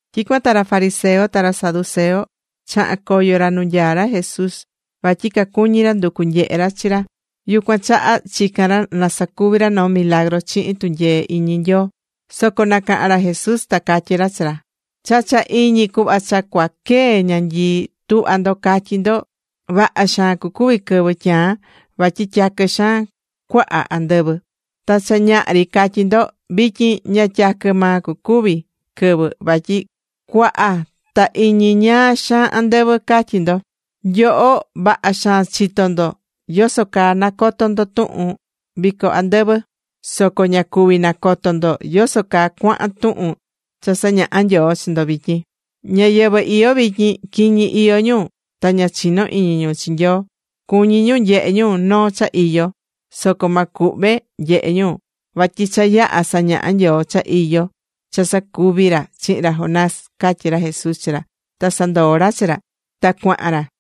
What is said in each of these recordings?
Tyicuan ta ra fariseo ta ra saduceo chaha̱n coyo ra nu nyaá ra Jesús. Vatyi cacuñí ra nducu nyehe ra chi ra yucuan chaha chicán ra na sacuvi ra noo milagru chihin tunyee iñi Nyoo. Soco nacaha̱n ra Jesús ta catyí ra chi ra: ―Cha cha iñi cuhva cha cuaa quee ñanyii, tuhvá ndo catyí ndo: “Vaha xaan cucuvi quɨvɨ tyaan, vatyi tyaquɨ xaan cuaha andɨvɨ.” Ta cha ñaha ri catyí ndo: “Vityin ña tyaquɨ maa cucuvi quɨvɨ vatyi cuaha ta iñi ñaa xaan andɨvɨ”, catyi ndo. Nyoho vaha xaan chitó ndo ¿yoso caa nacotó ndo tuhun vico andɨvɨ soco ña cuví nacoto ndo yoso caa cuahan tuhun cha sañahá Nyoo chi ndo vityin? Ñáyɨvɨ iyó vityin, quiñi iyó ñu ta ña chinó iñi ñu chi Nyoo. Cuñí ñu nyehe ñu noo cha iyo. Soco ma cuhve nyehe ñu vatyi cha yaha̱ sañaha̱ Nyoo cha iyó cha sacuvi̱ ra chihin ra Jonás ―catyí ra Jesús chi ra, ta sandoo̱ ra chi ra, ta cuahan ra.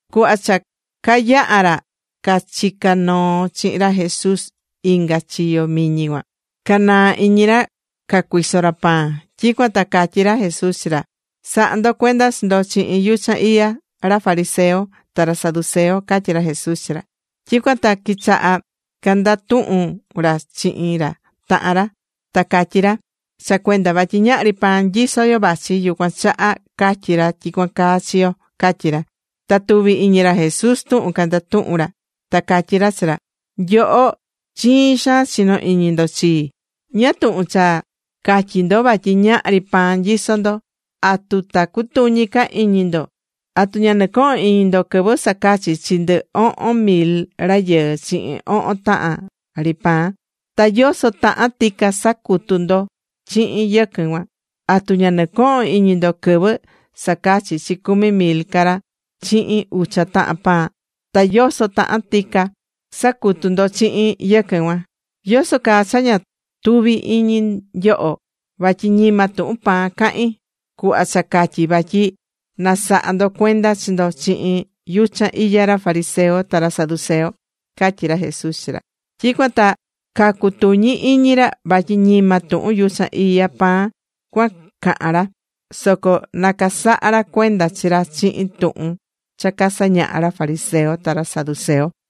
Cuhva cha cayaha̱ ra cachicá noo chihin ra Jesús inga chiyo miñi cuan, canaa̱ iñi ra cacuiso ra pan. Tyicuan ta catyí ra Jesús chi ra: ―Sa̱ha ndo cuenda chi ndo chihin yuchan iya ra fariseo ta ra saduceo ―catyí ra Jesús chi ra. Tyicuan ta quichaha̱ candatuhun ra chihin ra tahan ra ta catyí ra: ―Cha cuenda vatyi ñahri pan nyisó yo vachi, yucuan chaha catyí ra tyicuan caa chi yo ―catyí ra. Ta tuvi̱ iñi ra Jesús tuhun candatuhún ra, ta catyí ra chi ra: ―Nyoho, chiin xaan chinó iñi ndo chii. ¿Ñáá tuhun cha catyí ndo vatyi ñahri pan nyisó ndo? ¿Atu ta cutuñi ca iñi ndo? ¿Atu ña nɨcohón iñi ndo quɨvɨ sacachi chi ndɨ ohon mil rayɨɨ chihin ohon tahan ri pan? Ta ¿yoso tahan tica sacutu̱ ndo chihin yɨquɨn cuan? ¿Atu ña nɨcohón iñi ndo quɨvɨ sacachi̱ chi cumi mil ca ra chihin ucha tahan pan? Ta ¿yoso tahan tica sacutu̱ ndo chihin yɨquɨn cuan? ¿Yoso caa cha ña tuví iñi nyoho vatyi ñima tuhun pan cahín, cuhva cha catyi̱ vatyi na saha ndo cuenda chi ndo chihin yuchan iya ra fariseo ta ra saduceo? ―catyí ra Jesús chi ra. Tyicuan ta cacutuñí iñi ra vatyi ñima tuhun yuchan iya pan cuan cahán ra, soco na casaha ra cuenda chi ra chihin tuhun cha casañahá ra fariseo ta ra saduceo.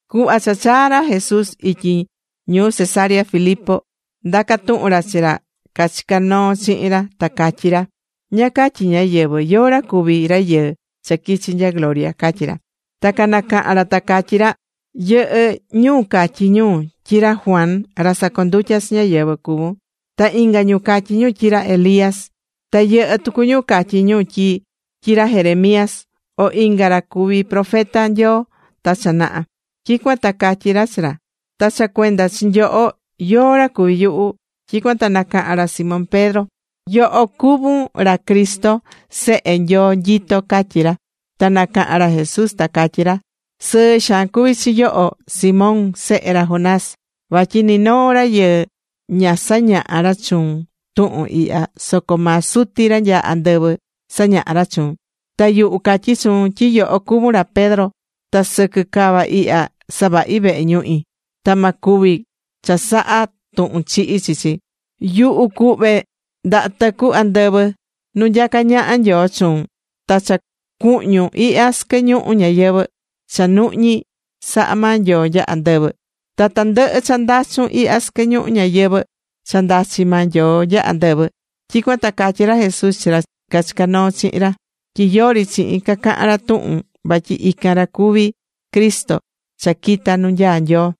Cuhva cha chaa̱ ra Jesús ityi ñuu Cesarea Filipo, ndaca̱ tuhun ra chi ra cachicá noo chihin ra ta catyí ra: ―¿Ñáá catyí ñáyɨvɨ? ¿Yóó ra cuvi Rayɨɨ cha quichi nya gloria? ―catyí ra. Ta canacaha̱n ra ta catyí ra: ―Yɨhɨ́ ñu catyí ñu tyi ra Juan ra sacondutya chi ñáyɨvɨ cuvún. Ta inga ñu catyí ñu tyi ra Elías, ta yɨhɨ́ tucu ñu catyí ñu tyi ra Jeremías, o inga ra cuví profeta Nyoo ta cha naha. Tyicuan ta catyí ra chi ra: ―Ta cha cuenda chi nyoho, ¿Yóó ra cuví yuhu? Tyicuan ta nacaha̱n ra Simón Pedro: ―Yoho cuvún ra Cristo, Sehe Nyoo nyitó ―catyí ra. Ta nacaha̱n ra Jesús ta catyí ra: ―Sɨɨ xaan cuví chi yoho, Simón sehe ra Jonás, vatyi ni noo rayɨɨ ña sañaha̱ ra chuun tuhun ihya, soco maa Suti ra nyaá andɨvɨ sañaha̱ chuun. Ta yuhu catyí chuun tyi yoho cuvún ra Pedro. Ta sɨquɨ cava ihya, savahí vehe ñuhi. Ta ma cuvi chasaha tuhun chihi chi chi. Yuhu cuhve ndaha tɨcu andɨvɨ nu nyacá ñaha Nyoo chuun. Ta cha cuhñun ihya sɨquɨ ñuhu ñayɨvɨ̱, cha nuhñi̱ saha̱ maa Nyoo nya andɨvɨ. Ta tandɨhɨ cha ndachun ihya sɨquɨ ñuhu ñayɨvɨ̱, cha ndachi maa Nyoo nya andɨvɨ. Tyicuan ta catyi̱ ra Jesús chi ra cachicá noo chihin ra tyi yori chihin cacahan ra tuhun vatyi ican ra cuví Cristo cha quita̱ nu nyaá Nyoo.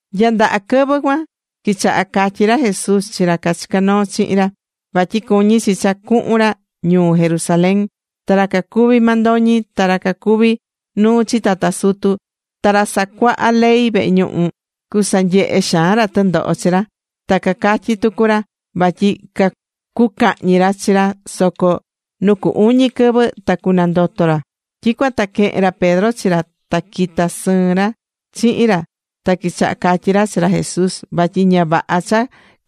Nya ndaha quɨvɨ cuan quichaha̱ catyí ra Jesús chi ra cachicá noo chihin ra, vatyi cuñí chi cha cuhun ra ñuu Jerusalén. Ta ra cacuví mandoñi, ta ra cacuví nuu chi tata sutu, ta ra sacuaha ley vehe ñuhu, cucasanyehe xaan ra tɨndoho chi ra. Ta catyí tucu ra vatyi cucahñi ra chi ra soco nu cu uñi quɨvɨ ta cunandoto ra. Tyicuan ta quehe̱n ra Pedro chi ra ta quita̱ sɨɨn ra chihin ra ta quichaha̱ catyí ra chi ra Jesús vatyi ña vaha cha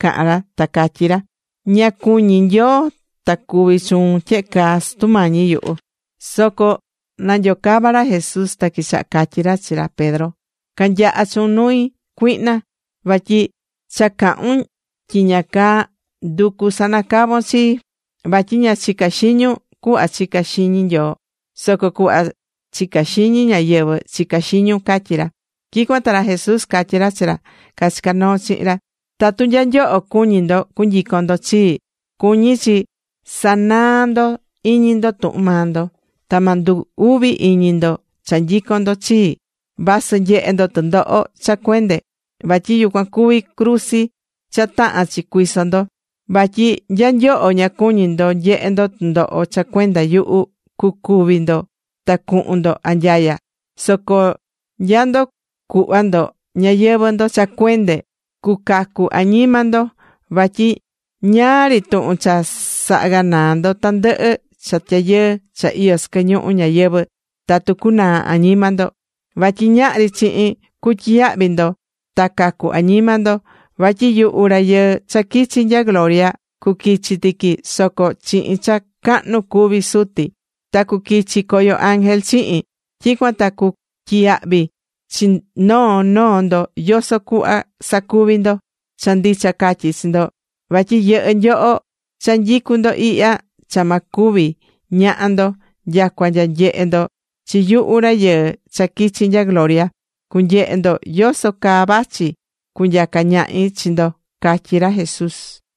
cahán ra ta catyí ra: ―Ña cuñí Nyoo ta cuvi chuun tyehe caa, Sutu Mañi yuhu. Soco nanyocava̱ ra Jesús, ta quichaha̱ catyí ra chi ra Pedro: ―¡Ca̱nyaha chuun nui, cuihna! Vatyi cha cahún tyiña caa nducú sanacavon chii. Vatyi ña chicá xiñun cuhva chicá xiñi Nyoo. Soco cuhva chicá xiñi ñáyɨvɨ chicá xiñun ―catyí ra. Tyicuan ta ra Jesús catyi̱ ra chi ra cachicá noo chihin ra: ―Tatu nya nyoho cuñí ndo cunyicon ndo chii, cuñí chi sa̱naa ndo iñi ndo tuhun maa ndo. Ta ma ndu uvi iñi ndo cha nyicón ndo chii, vasɨ nyehe ndo tɨndoho cha cuende vatyi yucuan cuví cruzi cha tahán chi cuiso ndo. Vatyi nya nyoho ña cuñí ndo nyehe ndo tɨndoho cha cuenda yuhu, cucúvi ndo ta cuhun ndo anyaya. Soco nya ndo cuhva ndo ñayɨvɨ̱ ndo cha cuende, cucacu añima ndo. Vatyi ñáá ri tuhun cha saha ganaa ndo tandɨhɨ cha tyayɨɨ cha iyó sɨquɨ ñuhu ñayɨvɨ̱ tatu cunaa añima ndo. Vatyi ñahri chihin cutyiyahvi ndo ta cacu añima ndo. Vatyi yuhu Rayɨɨ cha quichi̱ nya gloria, cuquichi tiqui soco chihin cha cahnu cuví Suti, ta cuquichi coyo ángel chihin. Tyicuan ta cutyiyahvi chi noo noo ndo yoso cuhva sacuvi̱ ndo. Cha ndicha catyí chi ndo, vatyi yɨhɨ́ nyoho cha nyicú ndo ihya cha ma cúvi ñaha ndo nyacua nya nyehe ndo chi yuhu Rayɨɨ cha quichi̱ nya gloria, cunyehe ndo yoso caa vachi cunyaca ñahi chi ndo ―catyí ra Jesús.